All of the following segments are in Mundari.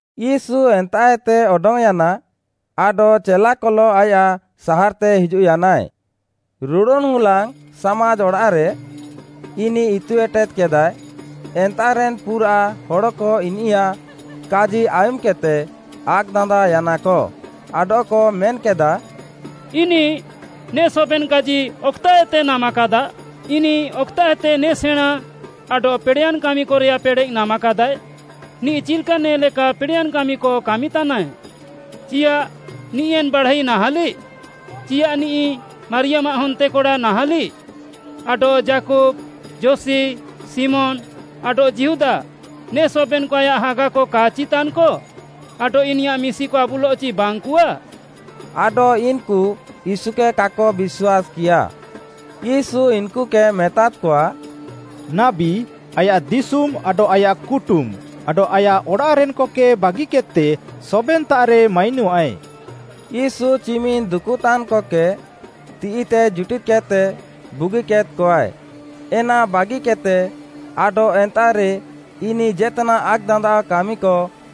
ୟୀଶୁ ଏନ୍ତାଃଏତେ ଅଡଙ୍ଗ୍‌ୟାନା। ଆଡଃ ଚେଲାକଲଃ ଆୟାଃ ସାହାର୍‌ତେ ହିଜୁଃୟାନାଏ। ରୁଡ଼ୁନ୍‌ ହୁଲାଙ୍ଗ୍‌ ସାମାଜ୍‌ ଅଡ଼ାଃରେ ଇନିଃ ଇତୁ ଏଟେଦ୍‌କେଦାଏ। ଏନ୍ତାଃରେନ୍‌ ପୁରାଃ ହଡ଼କ ଇନିୟାଃ କାଜି ଆୟୁମ୍‌କେଦ୍‌ତେ ଆକ୍‌ଦାନ୍ଦାଅୟାନାକ, ଆଡଃକ ମେନ୍‌କେଦାଃ, “ଇନିଃ ନେ ସବେନ୍‌କାଜି ଅକ୍‌ତାଃଏତେ ନାମାକାଦା? ଇନିଃ ଅକ୍‌ତାଃଏତେ ନେ ସେଣାଁଁ ଆଡଃ ପେଡ଼େୟାନ୍‌ କାମିକରେୟାଃ ପେଡ଼େଃ ନାମାକାଦାଏ? ନିଃ ଚିଲ୍‌କା ନେ ଲେକା ପେଡ଼େୟାନ୍‌ କାମିକ କାମିତାନାଏ? ଚିୟାଃ ନିଃ ଏନ୍‌ ବାଢ଼ାଇ ନାହାଁଲିଃ? ଚିୟାଃ ନିଃ ମାରିୟାମ୍‌ଆଃ ହନ୍ତେକଡ଼ା ନାହାଁଲିଃ? ଆଡଃ ଯାକୁବ୍‌, ଯୋସି, ଶିମୋନ୍‌ ଆଡଃ ଯିହୁଦା ନେ ସବେନ୍‌କ ଆୟାଃ ହାଗାକ କା'ଚି ତାନ୍‌କ? ଆଡଃ ଇନିୟାଃ ମିଶିକ ଆବୁଲଃଚି ବାଙ୍ଗ୍‌କଆ?” ଆଡଃ, ଇନ୍‌କୁ ୟୀଶୁକେ କାକ ବିଶ୍ୱାସ୍‌କିୟା। ୟୀଶୁ ଇନ୍‌କୁକେ ମେତାଦ୍‌କଆ, “ନାବୀ ଆୟାଃ ଦିଶୁମ୍‌ ଆଡଃ ଆୟାଃ କୁଟୁମ୍‌, ଆଡଃ ଆୟାଃ ଅଡ଼ାଃରେନ୍‌କକେ ବାଗିକେଦ୍‌ତେ ସବେନ୍‌ତାଃରେ ମାଇନଃଆଏ।” ୟୀଶୁ ଚିମିନ୍‌ ଦୁକୁତାନ୍‌କକେ ତିଃଇତେ ଜୁଟିଦ୍‌କେଦ୍‌ତେ ବୁଗିକେଦ୍‌କଆଏ, ଏନା ବାଗିକେଦ୍‌ତେ ଆଡଃ ଏନ୍ତାଃରେ ଇନିଃ ଜେତାନ୍‌ ଆକ୍‌ଦାନ୍ଦାଅ କାମିକ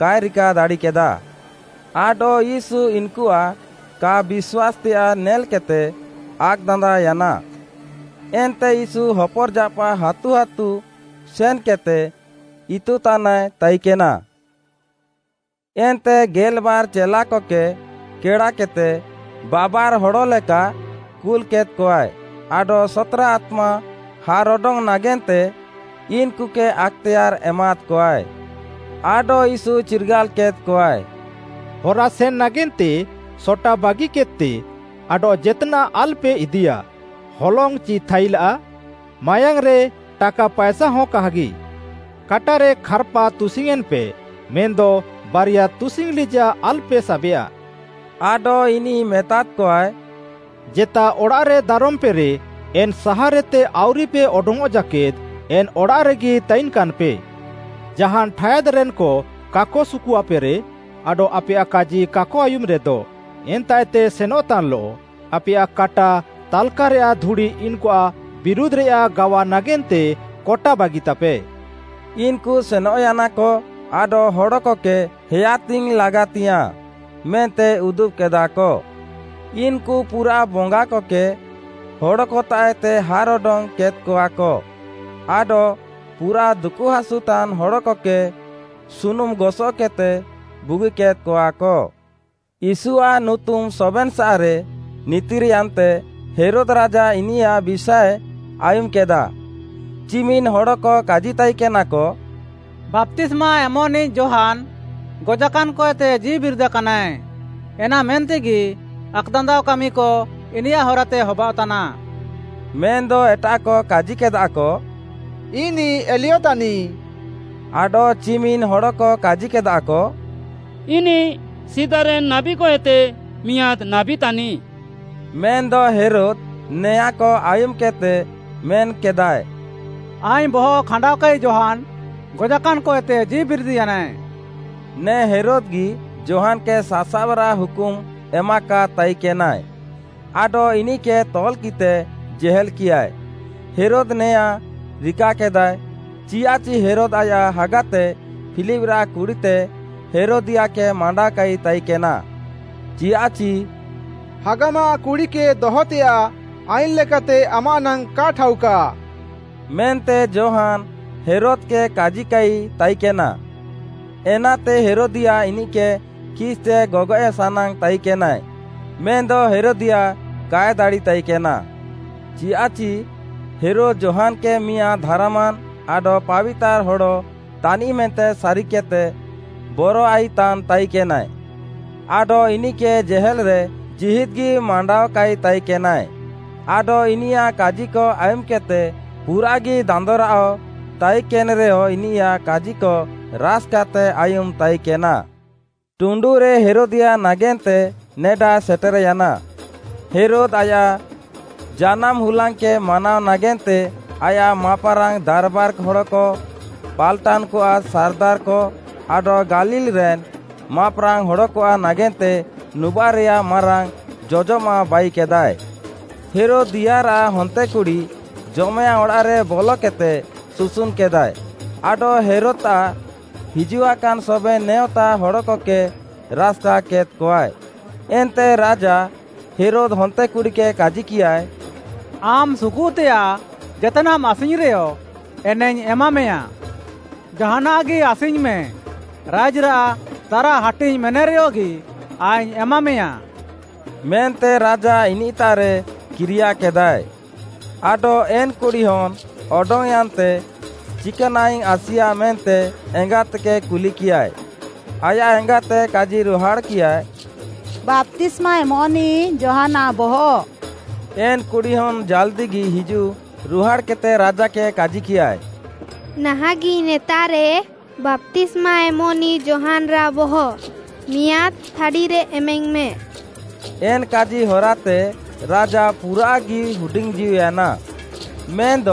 କାଏ ରିକା ଦାଡ଼ିକେଦାଃ। ଆଡଃ ୟୀଶୁ ଇନ୍‌କୁଆଃ କା ବିଶ୍ୱାସ୍‌ତେୟାଃ ନେଲ୍‌କେଦ୍‌ତେ ଆକ୍‌ଦାନ୍ଦାଅୟାନା। ଏନ୍ତେ ୟୀଶୁ ହପର୍‌ଜାପାଃ ହାତୁ ହାତୁ ସେନ୍‌କେଦ୍‌ତେ ଇତୁତାନାଏ ତାଇକେନା। ଏନ୍ତେ ଗେଲ୍‌ବାର୍‌ ଚେଲାକକେ କେଡ଼ାକେଦ୍‌ତେ, ବାବାର୍‌ହଡ଼୍‌ଲେକା କୁଲ୍‌କେଦ୍‌କଆଏ। ଆଡଃ ସତ୍‌ରା ଆତ୍ମା ହାର୍‌ଅଡଙ୍ଗ୍‌ ନାଗେନ୍ତେ ଇନ୍‌କୁକେ ଆକ୍‌ତେୟାର୍‌ ଏମାଦ୍‌କଆଏ। ଆଡଃ ୟୀଶୁ ଚିର୍ଗାଲ୍‌କେଦ୍‌କଆଏ, “ହରାସେନ୍‌ ନାଗେନ୍ତେ ସଟା ବାଗିକେଦ୍‌ତେ ଆଡଃ ଜେତ୍‌ନାଃ ଆଲ୍‌ପେ ଇଦିୟା, ହଲଙ୍ଗ୍‌ ଚି ଥାଇଲା, ମାୟାଙ୍ଗ୍‌ରେ ଟାକା ପାଏସା ହଁ କାହାଗି। କାଟାରେ ଖାର୍‌ପା ତୁସିଙ୍ଗ୍‌ୟେଁନ୍‌ପେ ମେନ୍‌ଦ ବାରିଆ ତୁସିଙ୍ଗ୍‌ ଲିଜାଃ ଆଲ୍‌ପେ ସାବେୟା। ଆଡଃ ଇନିଃ ମେତାଦ୍‌କଆଏ, ଜେତା ଅଡ଼ାଃରେ ଦାରମ୍‌ପେରେ, ଏନ୍‌ ସାହାର୍‌ଏତେ ଆଉରିପେ ଅଡଙ୍ଗ୍‌ଅଃ ଜାକେଦ୍‌ ଏନ୍‌ ଅଡ଼ାଃରେଗି ତାଇନ୍‌କାନ୍‌ପେ। ଜାହାନ୍‌ ଠାୟାଦ୍‌ରେନ୍‌କ କାକ ସୁକୁଆପେରେ, ଆଡଃ ଆପେୟାଃ କାଜି କାକ ଆୟୁମ୍‌ରେଦ, ଏନ୍ତାଃଏତେ ସେନଃତାନ୍‌ଲଃ, ଆପେୟାଃ କାଟା ତାଲ୍‌କାରେୟାଃ ଧୁଡ଼ି ଇନ୍‌କୁଆଃ ବିରୁଧ୍‌ରେଆଃ ଗାୱା ନାଗେନ୍ତେ କଟା ବାଗିତାପେ।” ଇନ୍‌କୁ ସେନଃୟାନାକ ଆଡଃ ହଡ଼କକେ ହେୟାତିଙ୍ଗ୍‌ ଲାଗାତିୟାଃଁ ମେନ୍ତେ ଉଦୁବ୍‌କେଦାକ। ଇନ୍‌କୁ ପୁରାଃ ବଙ୍ଗାକକେ ହଡ଼କତାଃଏତେ ହାର୍‌ଅଡଙ୍ଗ୍‌ କେଦ୍‌କଆକ ଆଡଃ ପୁରାଃ ଦୁକୁହାସୁତାନ୍‌ ହଡ଼କକେ ସୁନୁମ୍‌ ଗସଃକେଦ୍‌ତେ ବୁଗିକେଦ୍‌କଆକ। ୟୀଶୁଆଃ ନୁତୁମ୍‌ ସବେନ୍‌ସାଃରେ ନିତିର୍‌ୟାନ୍ତେ, ହେରୋଦ୍‌ ରାଜା ଇନିୟାଃ ବିଷାଏ ଆୟୁମ୍‌କେଦା। ଚିମିନ୍‌ ହଡ଼କ କାଜିତାଇକେନାକ, “ବାପ୍ତିସ୍ମା ଏମଃନିଃ ଯୋହାନ୍‌ ଗଜାକାନ୍‌ଏତେ ଜୀଉବିରିଦାକାନାଏ, ଏନା ମେନ୍ତେଗି ଆକ୍‌ଦାନ୍ଦାଅ କାମିକ ଇନିୟାଃ ହରାତେ ହବାଅଃତାନା।” ମେନ୍‌ଦ ଏଟାଃକ କାଜିକେଦାଃକ, “ଇନିଃ ଏଲିୟ ତାନିଃ, ଆଡଃ ଚିମିନ୍‌ ହଡ଼କ କାଜିକେଦାଃକ, ଇନିଃ ସିଦାରେନ୍ ନାବୀକଏତେ ମିଆଁଦ୍‌ ନାବୀ ତାନିଃ।” ମେନ୍‌ଦ ହେରୋଦ୍‌ ନେଆଁଁକ ଆୟୁମ୍‌କେଦ୍‌ତେ ମେନ୍‌କେଦାଏ, “ଆଇଙ୍ଗ୍‌ ବହଃ ଖାଣ୍ଡାଅକାନ୍‌ ଯୋହାନ୍‌ ଗଜାକାନ୍‌ କଏତେ ଜୀଉବିରିଦ୍‌ୟାନାଏ।” ନେ ହେରୋଦ୍‌ଗି ଯୋହାନ୍‌କେ ସାସାବ୍‌ରାଃ ହୁକୁମ୍‌ ଏମାକାଦ୍‌ ତାଇକେନାଏ, ଆଡଃ ଇନିଃକେ ତଲ୍‌କିଃତେ ଜେହେଲ୍‌କିୟାଏ, ହେରୋଦ୍‌ ନେଆଁଁ ରିକାକେଦାଏ, ଚିୟାଃଚି ହେରୋଦ୍‌ ଆୟାଃ ହାଗାତେ ଫିଲିପ୍‌ରାଃ କୁଡ଼ିତେ ହେରୋଦିୟାଃକେ ମାଣ୍ଡାଅକାଇ ତାଇକେନା। ଚିୟାଃଚି “ହାଗାମାଃ କୁଡ଼ିକେ ଦହତେୟାଃ ଆଇନ୍‌ ଲେକାତେ ଆମାଃ ନାଙ୍ଗ୍‌ କା ଠାଉକାଃ” ମେନ୍ତେ ଯୋହାନ୍‌ ହେରୋଦ୍‌କେ କାଜିକାଇ ତାଇକେନା। ଏନାତେ, ହେରୋଦିୟାଃ ଇନିଃକେ ଖିସ୍‌ତେ ଗଗଏଃ ସାନାଙ୍ଗ୍‌ ତାଇକେନାଏ, ମେନ୍‌ଦ ହେରୋଦିଆ କାଏ ଦାଡ଼ିତାଇକେନା। ଚିୟାଃଚି, ହେରୋଦ୍‌ ଯୋହାନ୍‌କେ ମିଆଁଦ୍‌ ଧାର୍‌ମାନ୍‌ ଆଡଃ ପାବିତାର୍‌ ହଡ଼ ତାନିଃ ମେନ୍ତେ ସାରିକେଦ୍‌ତେ ବରଆଇତାନ୍‌ ତାଇକେନାଏ ଆଡଃ ଇନିଃକେ ଜେହେଲ୍‌ରେ ଜୀହିଦ୍‌ଗି ମାଣ୍ଡାଅକାଇ ତାଇକେନାଏ। ଆଡଃ ଇନିୟାଃ କାଜିକ ଆୟୁମ୍‌କେଦ୍‌ତେ ପୁରାଃଗି ଦାନ୍ଦରାଅଃ ତାଇକେନ୍‌ରେୟ ଇନିୟାଃ କାଜିକ ରାସ୍‌କାତେ ଆୟୁମ୍‌ ତାଇକେନା। ଟୁଣ୍ଡୁରେ ହେରୋଦିଆ ନାଗେନ୍ତେ ନେଡା ସେଟେର୍‌ୟାନା, ହେରୋଦ୍‌ ଆୟାଃ ଜାନାମ୍‌ ହୁଲାଙ୍ଗ୍‌କେ ମାନାଅ ନାଗେନ୍ତେ, ଆୟାଃ ମାପ୍‌ରାଙ୍ଗ୍‌ ଦାର୍‌ବାର୍‌ ହଡ଼କ, ପାଲ୍‌ଟାନ୍‌କଆଃ ସାର୍‌ଦାର୍‌କ, ଆଡଃ ଗାଲିଲ୍‌ରେନ୍ ମାପ୍‌ରାଙ୍ଗ୍‌ ହଡ଼କଆଃ ନାଗେନ୍ତେ ନୁବାଃରେୟାଃ ମାରାଙ୍ଗ୍‌ ଜଜମାଃ ବାଇକେଦାଏ। ହେରୋଦିୟାଃରାଃ ହନ୍ତେକୁଡ଼ି ଜମେଅଡ଼ାଃରେ ବଲକେଦ୍‌ତେ ସୁସୁନ୍‌କେଦାଏ, ଆଡଃ ହେରୋଦ୍‌ତାଃ ହିଜୁଆକାନ୍‌ ସବେନ୍‌ ନେଅଁତା ହଡ଼କକେ ରାସ୍‌କା କେଦ୍‌କଆଏ। ଏନ୍ତେ ରାଜା ହେରୋଦ୍‌ ହନ୍ତେକୁଡ଼ିକେ କାଜିକିୟାଏ “ଆମ୍‌ ସୁକୁଃତେଆଃ ଜେତ୍‌ନାଃମ୍‌ ଆସିଙ୍ଗ୍‌ରେହଁ, ଏନାଇଙ୍ଗ୍‌ ଏମାମେୟାଁ।” “ଜାହାନାଃଗି ଆସିଙ୍ଗ୍‌ମେ, ରାଇଜ୍‌ରାଃ ତାରାହାଟିଙ୍ଗ୍‌ ମେନେରେୟଗି ଆଇଙ୍ଗ୍‌ ଏମାମେୟାଁ” ମେନ୍ତେ ରାଜା ଇନିଃତାଃରେ କିରିୟାକେଦାଏ। ଆଡଃ ଏନ୍‌ କୁଡ଼ିହନ୍‌ ଅଡଙ୍ଗ୍‌ୟାନ୍‌ତେ, ଚିକାନାଃଇଙ୍ଗ୍‌ ଆସିୟା ମେନ୍ତେ ଏଙ୍ଗାତେକେ କୁଲିକିୟାଏ? ଆୟାଃ ଏଙ୍ଗାତେ କାଜିରୁହାଡ଼୍‌କିୟା “ବାପ୍ତିସ୍ମା ଏମଃନିଃ ଯୋହାନ୍‌ଆଃ ବହଃ।” ଏନ୍‌ କୁଡ଼ିହନ୍‌ ଜାଲ୍‌ଦିଗି ହିଜୁଃ ରୁହାଡ଼୍‌କେଦ୍‌ତେ ରାଜାକେ କାଜିକିୟାଏ, “ନାହାଁଃଗି ନେତାଃରେ, ବାପ୍ତିସ୍ମା ଏମଃନିଃ ଯୋହାନ୍‌ରାଃ ବହଃ ମିଆଁଦ୍‌ ଥାଡ଼ିରେ ଏମାଇଙ୍ଗ୍‌ମେ।” ଏନ୍‌ କାଜି ହରାତେ ରାଜା ପୁରାଃଗି ହୁଡିଙ୍ଗ୍‌ଜୀଉୟାନା, ମେନ୍‌ଦ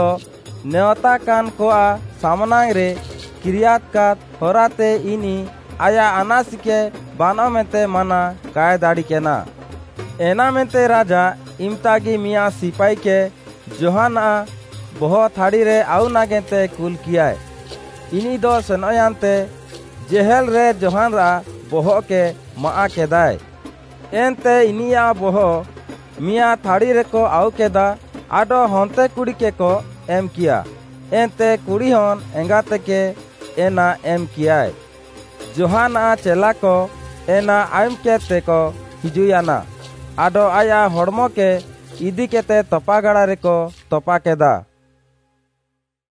ନେଅଁତାକାନ୍‌କଆଃ ସାମ୍‌ନାଙ୍ଗ୍‌ରେ କିରିୟାକାଦ୍‌ ହରାତେ ଇନିଃ ଆୟାଃ ଆନାସିକେ ବାନଃ ମେନ୍ତେ ମାନା କାଏ ଦାଡ଼ିକେନା। ଏନା ମେନ୍ତେ ରାଜା ଇମ୍‌ତାଗି ମିଆଁଦ୍‌ ସିପାଇକେ, ଯୋହାନ୍‌ଆଃ ବହଃ ଥାଡ଼ିରେ ଆଉ ନାଗେନ୍ତେ କୁଲ୍‌କିୟାଏ, ଇନିଃଦ ସେନଃୟାନ୍ତେ, ଜେହେଲ୍‌ରେ ଯୋହାନ୍‌ରାଃ ବହଃକେ ମାଆଃକେଦାଏ, ଏନ୍ତେ ଇନିୟାଃ ବହଃ ମିଆଁଦ୍‌ ଥାଡ଼ିରେକ ଆଉକେଦା ଆଡଃ ହନ୍ତେକୁଡ଼ିକେକ ଏମ୍‌କିୟା, ଏନ୍ତେ କୁଡ଼ିହନ୍‌ ଏଙ୍ଗାତେକେ ଏନା ଏମ୍‌କିୟାଏ। ଯୋହାନ୍‌ଆଃ ଚେଲାକ ଏନା ଆୟୁମ୍‌କେଦ୍‌ତେକ ହିଜୁଃୟାନା ଆଡଃ ଆୟାଃ ହଡ଼୍‌ମକେ ଇଦିକେଦ୍‌ତେ ତପାଗାଡ଼ାରେକ ତପାକେଦା।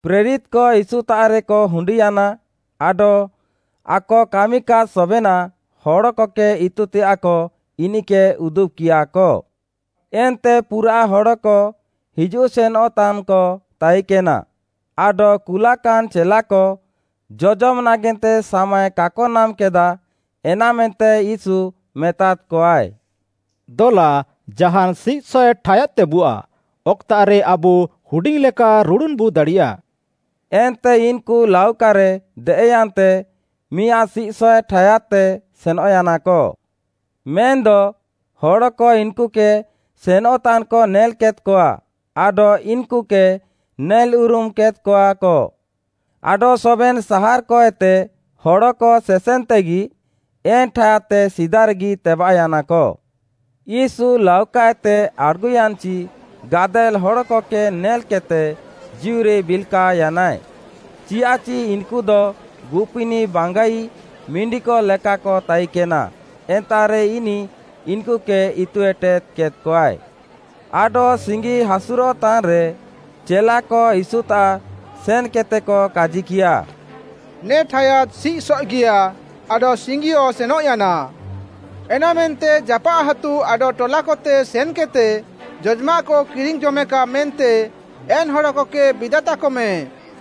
ପ୍ରେରିତ୍‌କ ୟୀଶୁତାଃରେକ ହୁଣ୍ଡିୟାନା, ଆଡଃ ଆକ କାମିକାଦ୍ ସବେନାଃ, ହଡ଼କକେ ଇତୁତେଆଃକ ଇନିଃକେ ଉଦୁବ୍‌କିୟାକ। ଏନ୍ତେ ପୁରାଃ ହଡ଼କ ହିଜୁଃ ସେନଃତାନ୍‌କ ତାଇକେନା, ଆଡଃ କୁଲାକାନ୍‌ ଚେଲାକ ଜଜମ୍‌ ନାଗେନ୍ତେ ସାମାଏ କାକ ନାମ୍‌କେଦାଃ, ଏନାମେନ୍ତେ ୟୀଶୁ ମେତାଦ୍‌କଆଏ, “ଦଲା ଜାହାନ୍‌ ସିଃସଏଃ ଠାୟାଦ୍‌ତେବୁଆଃ, ଅକ୍‌ତାଃରେ ଆବୁ ହୁଡିଙ୍ଗ୍‌ଲେକା ରୁଡ଼ୁନ୍‌ବୁ ଦାଡ଼ିୟାଃ।” ଏନ୍ତେ ଇନ୍‌କୁ ଲାଉକାରେ ଦେଏଃୟାନ୍ତେ ମିଆଁଦ୍‌ ସିଃସଏଃ ଠାୟାଦ୍‌ତେ ସେନଃୟାନାକ। ମେନ୍‌ଦ, ହଡ଼କ ଇନ୍‌କୁକେ ସେନଃତାନ୍‌କ ନେଲ୍‌କେଦ୍‌କଆ ଆଡଃ ଇନ୍‌କୁକେ ନେଲ୍‌ଉରୁମ୍‌ କେଦ୍‌କଆକ, ଆଡଃ ସବେନ୍‌ ସାହାର୍‌କଏତେ ହଡ଼କ ସେସେନ୍‌ତେଗି ଏନ୍‌ ଠାୟାଦ୍‌ତେ ସିଦାରେଗି ତେବାଃୟାନାକ। ୟୀଶୁ ଲାଉକାଏତେ ଆଡ଼୍‌ଗୁୟାନ୍‌ଚି ଗାଦେଲ୍‌ ହଡ଼କକେ ନେଲ୍‌କେଦ୍‌ତେ ଜୀଉରେ ବିଲ୍‌କାଅୟାନାଏ, ଚିୟାଃଚି ଇନ୍‌କୁଦ ଗୁପିନିଃ ବାଙ୍ଗାଇ ମିଣ୍ଡିକ ଲେକାକ ତାଇକେନା, ଏନ୍ତାଃରେ ଇନିଃ ଇନ୍‌କୁକେ ଇତୁ ଏଟେଦ୍‌କେଦ୍‌ଆଏ। ଆଡଃ ସିଙ୍ଗି ହାସୁରଃତାନ୍‌ରେ, ଚେଲାକ ୟୀଶୁତାଃ ସେନ୍‌କେଦ୍‌ତେକ କାଜିକିୟା, “ନେ ଠାୟାଦ୍‌ ସିଃସଏଃଗିୟା, ଆଡଃ ସିଙ୍ଗିଅଃ ସେନଃୟାନା। ଏନାମେନ୍ତେ ଜାପାଃ ହାତୁ ଆଡଃ ଟଲାକତେ ସେନ୍‌କେଦ୍‌ତେ ଜଜ୍‌ମାଃକ କିରିଙ୍ଗ୍‌ ଜମେକା ମେନ୍ତେ ଏନ୍‌ ହଡ଼କକେ ବିଦାତାକମେଁ।”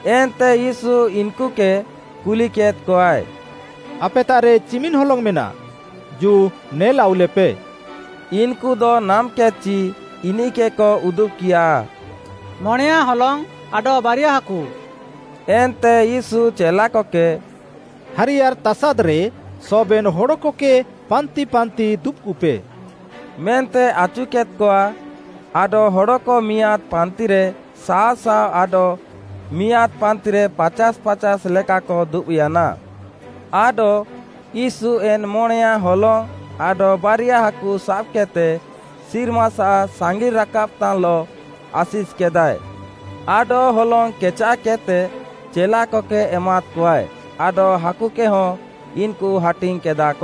ଏନ୍ତେ ୟୀଶୁ ଇନ୍‌କୁକେ କୁଲିକେଦ୍‌କଆଏ, “ଆପେତାଃରେ ଚିମିନ୍‌ ହଲଙ୍ଗ୍‌ ମେନାଃ? ଜୁ, ନେଲାଉଲେପେ,” ଇନ୍‌କୁଦ ନାମ୍‌କେଦ୍‌ଚି ଇନିଃକେକ ଉଦୁବ୍‌କିୟା, “ମଣେୟାଁ ହଲଙ୍ଗ୍‌ ଆଡଃ ବାରିଆ ହାକୁ।” ଏନ୍ତେ ୟୀଶୁ ଚେଲାକକେ “ହାରିୟାର୍‌ ତାସାଦ୍‌ରେ ସବେନ୍‌ ହଡ଼କକେ ପାନ୍ତିପାନ୍ତି ଦୁବ୍‌କୁପେ” ମେନ୍ତେ ଆଚୁକେଦ୍‌କଆ। ଆଡଃ ହଡ଼କ ମିଆଁଦ୍‌ ପାନ୍ତିରେ ଶାଅ ଶାଅ ଆଡଃ ମିଆଁଦ୍‌ ପାନ୍ତିରେ ପାଚାଶ୍‌ ପାଚାଶ୍‌ ଲେକାକ ଦୁବ୍‌ୟାନା। ଆଡଃ, ୟୀଶୁ ଏନ୍‌ ମଣେୟାଁ ହଲଙ୍ଗ୍‌ ଆଡଃ ବାରିଆ ହାକୁ ସାବ୍‌କେଦ୍‌ତେ ସିର୍ମାସାଃ ସାଙ୍ଗିଲ୍‌ରାକାବ୍‌ତାନ୍‌ଲଃ ଆଶିଷ୍‌କେଦାଏ ଆଡଃ ହଲଙ୍ଗ୍‌ କେଚାଃକେଦ୍‍ତେ ଚେଲାକକେ ଏମାଦ୍‍କଆଏ ଆଡଃ ହାକୁକେହଁ ଇନ୍‌କୁ ହାଟିଙ୍ଗ୍‌କେଦାଃକ।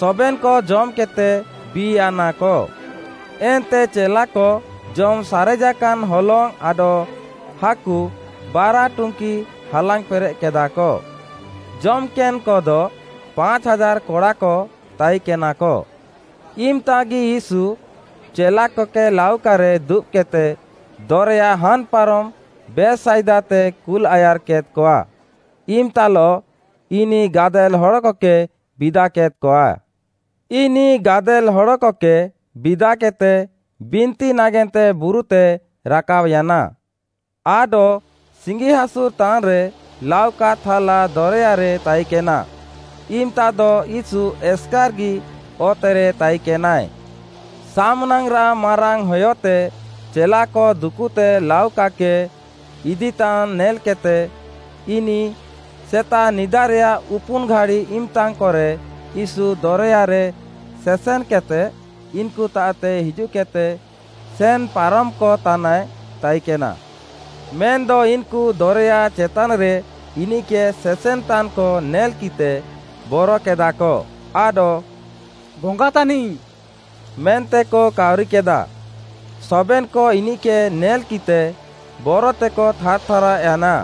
ସବେନ୍‌କ ଜମ୍‌କେଦ୍‌ତେ ବି'ୟାନାକ। ଏନ୍ତେ ଚେଲାକ ଜମ୍‌ ସାରେଜାକାନ୍ ହଲଙ୍ଗ୍‌ ଆଡଃ ହାକୁ ବାରା ଟୁଙ୍କିକ ହାଲାଙ୍ଗ୍‌ ପେରେଃକେଦାଃକ। ଜମ୍‌କେନ୍‌କଦ, ପାଞ୍ଚ୍‌ ହାଜାର୍‌ କଡ଼ାକ ତାଇକେନାକ। ଇମ୍‌ତାଗି ୟୀଶୁ ଚେଲାକକେ ଲାଉକାରେ ଦୁବ୍‌କେଦ୍‌ତେ ଦରେୟା ହାନ୍‌ ପାରମ୍‌ ବେଥ୍‌ସାଇଦାତେ କୁଲ୍‌ ଆୟାର୍‌କେଦ୍‌କଆ। ଇମ୍‌ତାଲଃ ଇନିଃ ଗାଦେଲ୍‌ ହଡ଼କକେ ବିଦାକେଦ୍‌କଆ। ଇନିଃ ଗାଦେଲ୍‌ ହଡ଼କକେ ବିଦାକେଦ୍‌ତେ, ବିନ୍ତି ନାଗେନ୍ତେ ବୁରୁତେ ରାକାବ୍‌ୟାନା। ଆଡଃ ସିଙ୍ଗିହାସୁର୍‌ତାନ୍‌ରେ ଲାଉକା ଥାଲା ଦରେୟାରେ ତାଇକେନା, ଇମ୍‌ତାଦ ୟୀଶୁ ଏସ୍‌କାର୍‌ଗି ଅତେରେ ତାଇକେନାଏ। ସାମ୍‌ନାଙ୍ଗ୍‌ରାଃ ମାରାଙ୍ଗ୍‌ହୟତେ ଚେଲାକ ଦୁକୁତେ ଲାଉକାକେ ଇଦିତାନ୍‌ ନେଲ୍‌କେଦ୍‌ତେ, ଇନିଃ ସେତାଃ ନିଦାରେୟାଃ ଉପୁନ୍‌ ଘାଡ଼ି ଇମ୍‌ତାକରେ ୟୀଶୁ ଦରେୟାରେ ସେସେନ୍‌କେଦ୍‌ତେ ଇନ୍‌କୁତାଃତେ ହିଜୁଃକେଦ୍‌ତେ ସେନ୍‌ପାରମ୍‌କତାନାଏ ତାଇକେନା। ମେନ୍‌ଦ ଇନ୍‌କୁ ଦରେୟା ଚେତାନ୍‌ରେ ଇନିଃକେ ସେସେନ୍‌ତାନ୍‌କ ନେଲ୍‌କିଃତେ ବରକେଦାକ ଆଡଃ “ବଙ୍ଗା ତାନିଃ” ମେନ୍ତେକ କାଉରିକେଦା। ସବେନ୍‌କ ଇନିଃକେ ନେଲ୍‌କିଃତେ ବରତେକ ଥାର୍‌ଥାରାଅୟାନା।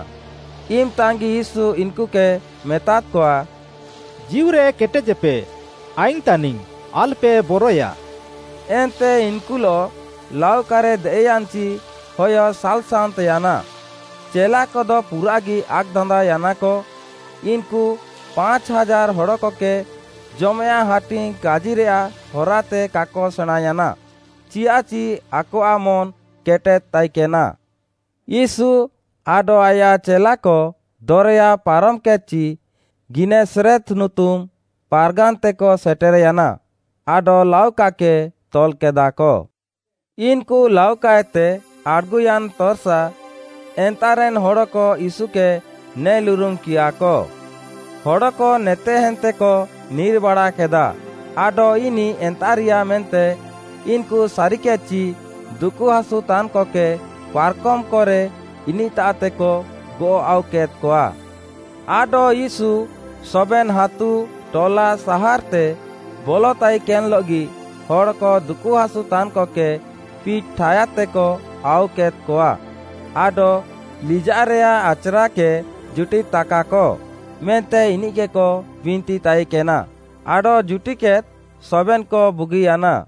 ଇମ୍‌ତାଗି ୟୀଶୁ ଇନ୍‌କୁକେ ମେତାଦ୍‌କଆ, “ଜୀଉରେ କେଟେଜେପେ, ଆଇଙ୍ଗ୍‌ ତାନିଙ୍ଗ୍‌ ଆଲ୍‌ପେ ବରଏୟା।” ଏନ୍ତେ ଇନ୍‌କୁଲଃ ଲାଉକାରେ ଦେଏଃୟାନ୍‌ଚି ହୟ ସାଲ୍‌ସାନ୍ତ୍‌ୟାନା, ଚେଲାକଦ ପୁରାଃଗି ଆକ୍‌ଦାନ୍ଦାଅୟାନାକ, ଇନ୍‌କୁ ପାଞ୍ଚ୍‌ ହାଜାର୍‌ ହଡ଼କକେ ଜମେୟାଃଁ ହାଟିଙ୍ଗ୍‌ କାଜିରାଃ ହରାତେ କାକ ସେଣାଁଁୟାନା, ଚିୟାଃଚି ଆକଆଃ ମନ୍‌ କେଟେଦ୍‌ ତାଇକେନା। ୟୀଶୁ ଆଡଃ ଆୟାଃ ଚେଲାକ ଦରେୟା ପାରମ୍‌କେଦ୍‌ଚି ଗିନେସରେତ୍‌ ନୁତୁମ୍‌ ପାର୍‌ଗାନ୍‌ତେକ ସେଟେର୍‌ୟାନା, ଆଡଃ ଲାଉକାକେ ତଲ୍‌କେଦାକ। ଇନ୍‌କୁ ଲାଉକାଏତେ ଆଡ଼୍‌ଗୁୟାନ୍‌ ତର୍‌ସା, ଏନ୍ତାଃରେନ୍‌ ହଡ଼କ ୟୀଶୁକେ ନେଲ୍ଉରୁମ୍‌କିୟାକ। ହଡ଼କ ନେତେହେନ୍ତେକ ନିର୍‌ବାଡ଼ାକେଦା ଆଡଃ ଇନିଃ ଏନ୍ତାଃରିୟା ମେନ୍ତେ ଇନ୍‌କୁ ସାରିକେଦ୍‌ଚି ଦୁକୁହାସୁତାନ୍‌କକେ ପାର୍‌କମ୍‌କରେ ଇନିଃତାଃତେକ ଗଅଃ ଆଉକେଦ୍‌କଆ। ଆଡଃ ୟୀଶୁ ସବେନ୍‌ ହାତୁ, ଟଲା, ସାହାର୍‌ତେ ବଲଃତାଇକେନ୍‌ଲଃଗି, ହଡ଼କ ଦୁକୁହାସୁତାନ୍‌କକେ ପିଟ୍‌ ଠାୟାଦ୍‌ତେକ ଆଉକେଦ୍‌କଆ, ଆଡଃ ଲିଜାଃରେୟାଃ ଆଚ୍‌ରାକେ ଜୁଟିଦ୍‌ତାକାକ ମେନ୍ତେ ଇନିଃକେକ ବିନ୍ତି ତାଇକେନା, ଆଡଃ ଜୁଟିଦ୍‌କେଦ୍‍ ସବେନ୍‌କ ବୁଗିୟାନା।